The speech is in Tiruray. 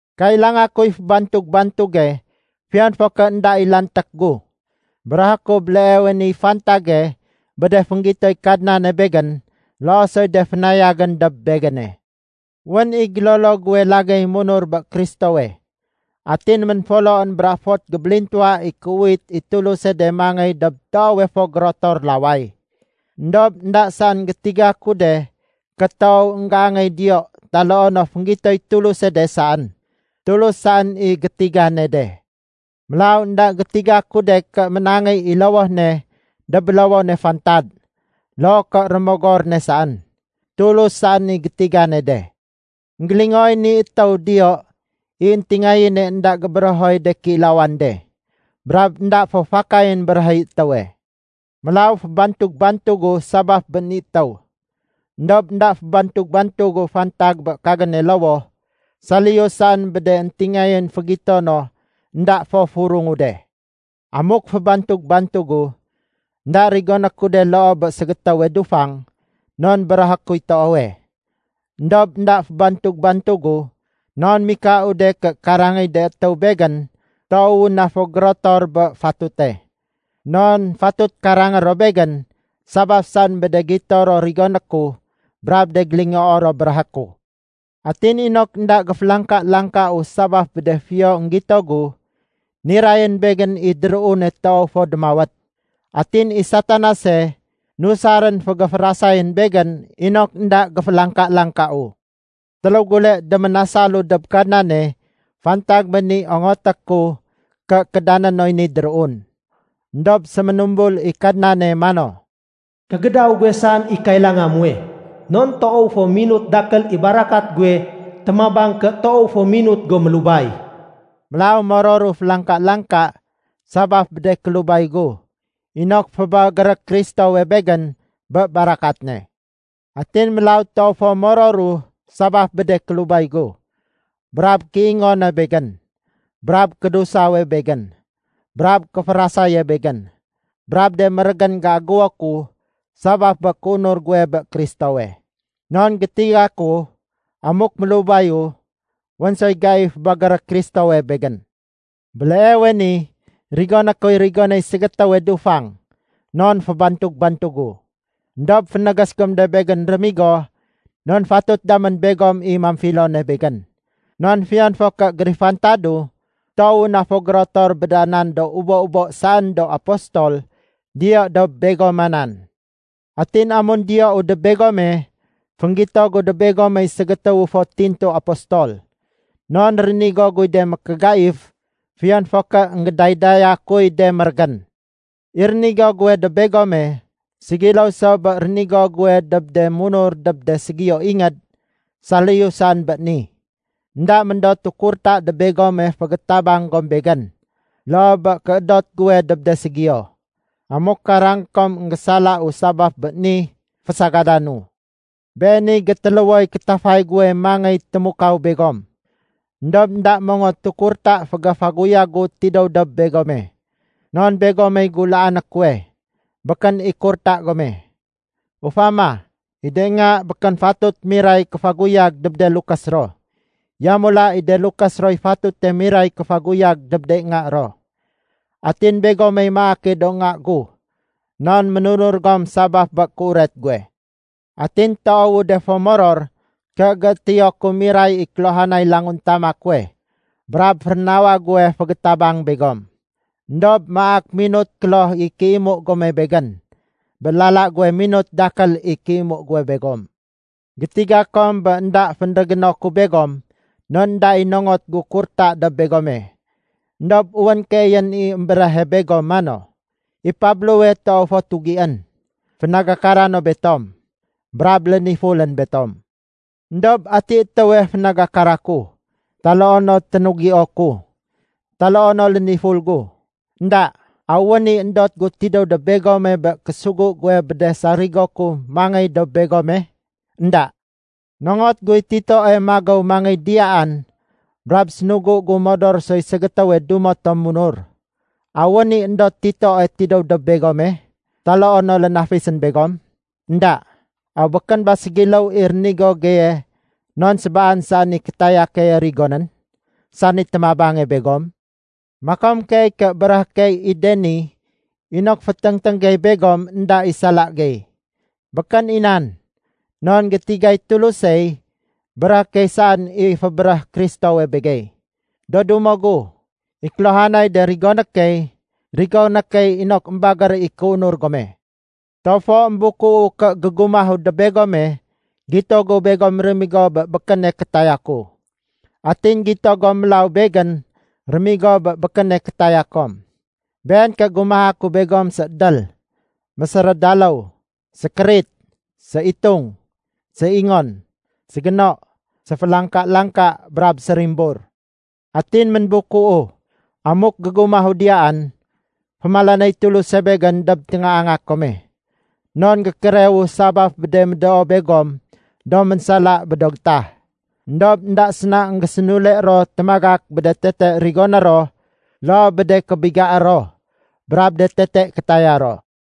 Kailanga kuy fébantug-bantuge fiyon fo ké énda i lanték gu. Béréhé ku béleewe niy fantage bé de fénggitoy Kadnane begén loo soy de fénayagén dob begéne. Wén i gélolo guwe lagéy munur bé Kristowe, atin ménfoloén bra fot gébélintuwa i kéuwit i Tuluse de mangéy dob toowe fo gérotor laway. Endob énda saén gétiga ku de ké toow énggéangéy diyo taloo no fénggitoy Tuluse de saén. Tulus saén i gétigane de. Mélaw énda gétiga ku de ké ménangéy i lowoh ne dob bélowone fantad loo ké rémogor ne saén. Tulus saén i gétigane de. Enggélingooy ni étéw diyo i de éntingayén énda gébéréhoy de kéilawan de, brab énda fo fakayén béréhéy étéwe. Mélaw fébantug-bantugu sabaf bé ni étéw, éndob énda fébantug-bantugu fantag bé kagéne lowoh saliyu saén bé de éntingayén fégito no énda fo furungu de. Amuk fébantug-bantugu, énda rigoné ku de loo bé ségétéwe dufang non béréhé kuy toowe. Endob énda fébantug-bantugu non mikau de ké karangéy de étéw begén toowu na fo gérotor bé fatute. Non fatut karangé ro begén sabaf saén bé de gito ro rigoné ku brab de gélingoo ro béréhé ku. Atin inok énda géfélangka-langkau sabaf bé de fiyo énggito gu, nirayén begén i déruune toow fo démawét. Atin i Satanase nusarén fégéférasayén begén inok énda géfélangka-langkau. Téléw gule déménasalu dob Kadnane fantag bé ni ongoté ku ké kédané noy ni déruun. Endob séménumbul i Kadnane mano, “Kégédaw guwe saén i kailanga muwe. Non toow fo minut dakél i barakat guwe témabang ké toow fo minut go mélubay.” Mélaw mororu félangka-langka sabaf bé de kélubay gu inok fébagéré Kristowe begén bé barakat ne. Atin mélaw toow fo mororu sabaf bé de kélubay gu, brab kéingone begén, brab kédusawe begén, brab kéférasaye begén, brab de mérégén géagéwo ku sabaf bé kéunur guwe bé Kristowe. Non gétiga ku amuk mélubayu, wén soy gai fébagéré Kristowe begén. Béleewe ni rigoné kuy rigonéy ségétéwe dufang non fébantug-bantugu. Endob fénégés gom de begén rémigo non fatut damén begom i mamfilone begén. Non fiyon fo ké gérifantadu, toowu na fo gérotor bé da nan do ubo-ubo saén do apostol diyo dob begoma nan. Atin amun diyou dob begome, fénggito gu dob begomey ségétéwu fo tintu apostol. Non rénigo guy de mékégaif fiyon fo ké énggédaydaya kuy de mérégén. I rénigo guwe dob begome ségiléw so bé rénigo guwe dob de munur dob de ségiyo ingéd saliyu saén bé ni. Enda méndotu kurta dob begome fégétabang gom begén loo bé kéédot guwe dob de ségiyo. Amuk karangé kom énggésalau sabaf bé ni, fésagadanu! Beeniy gétéléwoy kétafay guwe mangéy témukaw begom, éndob énda mongotu kurta fégéfaguyag gu tidéw dob begome. Non begomey gulaané kuwe, békén i kurta gome. Ufama, i de nga békén fatut miray kéfaguyag dob de lukés ro, yamula i de lukés roy fatute miray kéfaguyag dob de nga ro. Atin begomey maake do nga gu non ménunur gom sabaf bé kéuret guwe. Atin toowu de fo moror ké géétéyo ku miray i kéluhanay languntama kuwe brab férénawa guwe fégétabang begom. Endob maak minut kloh i kéimu gome begén bé lala guwe minut dakél i kéimu guwe begom. Gétiga kom bé énda fénrégéno ku begom non énda i nongot gu kurta dob begome. Endob wén keeyén i émbéréhe begom mano, “I Pablowe toow fo tugién, fénagakara no betom, brab lénifulén betom.” Endob ati étéwe fénagakara ku, taloo no ténugio ku, taloo no léniful gu? Enda! Aw wén i éndot gu tidéw dob begome bé késugu guwe bé de sarigo ku mangéy dob begome? Enda! Nongot guy Titoe magéw mangéy diyaan brab sénugu gu modor soy ségétéwe dumo tom munur. Aw wén i éndot Titoe tidéw dob begome, taloo no lénafisén begom? Enda! Aw békén ba ségiléw i rénigo geye non sébaan saén i kétaya keye rigonén, sani témabange begom? Makom keey ké béréhé key i de ni inok féténgténg gey begom énda i sala gey. Békén i nan. Non gétigay Tulusey, béréhé key saén i fébéréh Kristowe begey. Do dumo gu, i kéluhanay de rigoné key, rigoné key inok émbagér i kéunur gome. Toow fo émbukuu ké gégumahu dob begome, gito gu begom rémigo bé békéne kétaya ku. Atin gito gom mélaw begén rémigo bé békéne kétaya kom. Been ké gumaha ku begom, séédél, mésérédaléw, sékérit, séitung, séingon, ségéno, séfélangka-langka, brab sérimbur. Atin ménbukuu amuk gégumahu diyaan, fémalanéy Tuluse begén dob téngaanga kome, non gékérewu sabaf bé de médoo begom do ménsala bé do gétah, éndob énda séna énggésénule ro témagak bé de tete rigoné ro loo bé de kébigaé ro brab de tete kétaya ro.